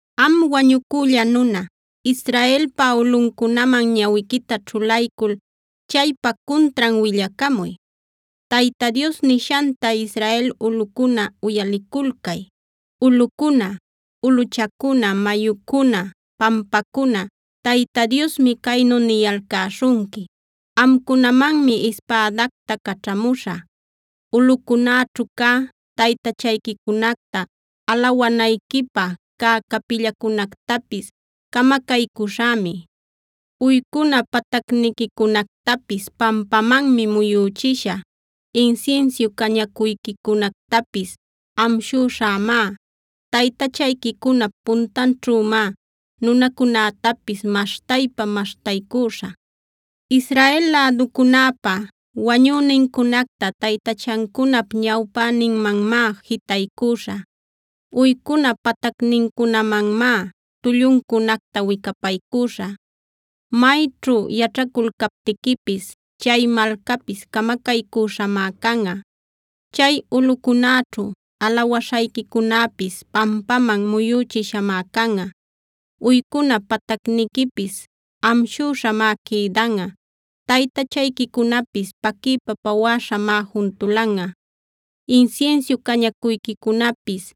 “Am wañucülla nuna, Israelpa ulꞌuncunaman ñawiquita ćhulaycul chaypa cuntran willacamuy: ‘Tayta Dios nishanta Israel ulꞌucuna uyaliculcay. Ulꞌucuna, ulꞌuchacuna, mayucuna, pampacuna Tayta Diosmi caynu niyalcäśhunqui: Amcunamanmi ispädacta caćhamuśhä. Ulꞌucunäćhu cä taytachayquicunacta, alawanayquipä cä capillacunactapis camacaycüśhämi. Uycuna patacniquicunactapis pampamanmi muyüchishä, insinsiu cañacuyquicunactapis amshüśhämá. Taytachayquicunap puntanćhümá nunacunätapis maśhtaypa-maśhtaycüśhä. Israel läducunäpa wañünincunacta taytachancunap ñawpäninmanmá jitaycüśhä. Uycuna patacnincunamanmá tulluncunacta wicapaycüśhä. Mayćhu yaćhaculcaptiquipis chay malcapis camacaycüśhamá canꞌa; chay ulꞌucunäćhu alawaśhayquicunäpis pampaman muyüchishamá canꞌa. Uycuna patacniquipis amshüśhamá quïdanꞌa; taytachayquicunapis paquiypa pawäśhamá juntulanꞌa. Insinsiu cañacuyquicunapis,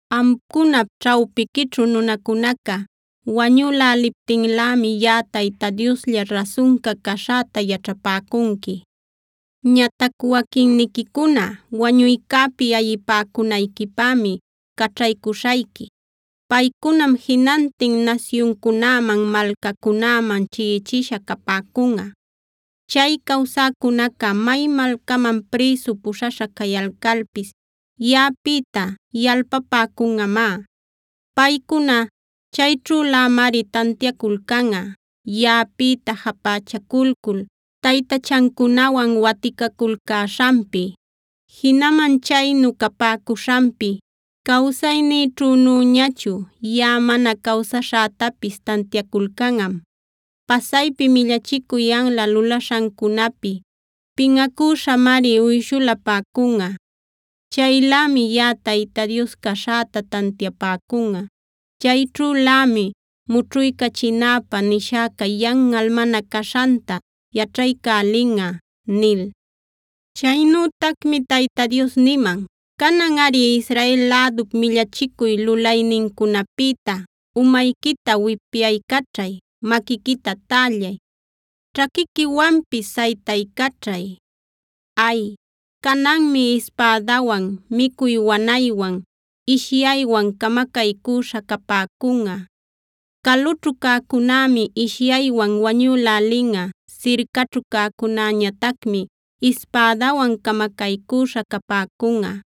Amcunap ćhawpiquićhu nunacunaca wañüläliptinlämi yaꞌa Tayta Dioslla rasunca caśhäta yaćhapäcunqui. “ ‘Ñatac waquinniquicuna wañuycäpi ayipäcunayquipämi caćhaycuśhayqui. Paycunam jinantin nasyuncunäman, malcacunäman chiꞌichisha capäcunꞌa. Chay cawsäcunaca may malcaman prïsu puśhaśha cayalcalpis yaꞌapïta yalpapäcunꞌamá. Paycuna chayćhülämari tantiaculcanꞌa, yaꞌapïta japächaculcul, taytachancunawan waticaculcäśhanpi. Jinaman chaynu capäcuśhanpi cawsaynïćhünüñachu yaꞌa mana cawsaśhätapis tantiaculcanꞌam. Pasaypi millachicuy anla lulaśhancunapi pinꞌacüśhamari uyshulapäcunꞌa. Chaylämi yaꞌa Tayta Dios caśhäta tantiapäcunꞌa; chayćhülämi mućhuycachinäpä nishäca yanꞌal mana caśhanta yaćhaycälinꞌa’” nil. Chaynütacmi Tayta Dios niman: “Cananꞌari Israel lädup millachicuy lulaynincunapïta umayquita wipyaycaćhay, maquiquita tällay, ćhaquiquiwanpis saytaycaćhay. Ay, cananmi ispädawan, micuy wanaywan, ishyaywan camacaycüśha capäcunꞌa. Calućhu cäcunämi ishyaywan wañülälinꞌa; sircaćhu cäcunäñatacmi ispädawan camacaycüśha capäcunꞌa.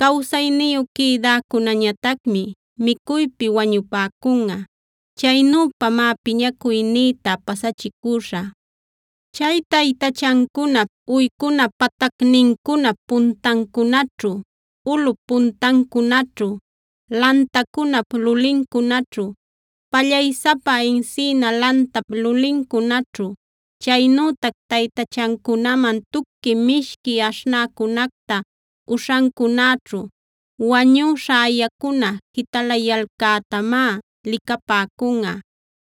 Cawsayniyu quïdäcunäñatacmi micuypi wañupäcunꞌa. Chaynüpamá piñacuynïta pasachicüśhä. Chay taytachancunap, uycuna patacnincunap puntancunaćhu, ulꞌup puntancunaćhu, lantacunap lulincunaćhu, pallaysapa encina lantap lulincunaćhu, chaynütac taytachancunaman tuqui mishqui aśhnäcunacta uśhancunäćhu wañüśha ayacuna jitalayalcätamá licapäcunꞌa.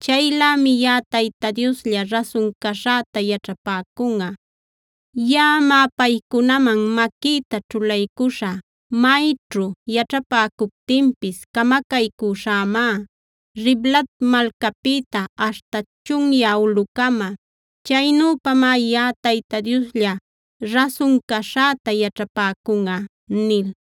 Chaylämi yaꞌa Tayta Dioslla rasun caśhäta yaćhapäcunꞌa. Yaꞌamá paycunaman maquïta ćhulaycuśhä. Mayćhu yaćhapäcuptinpis camacaycüśhämá, Riblat malcapïta aśhta chunyä ulꞌucama. Chaynüpamá yaꞌa Tayta Dioslla rasun caśhäta yaćhapäcunꞌa” nil.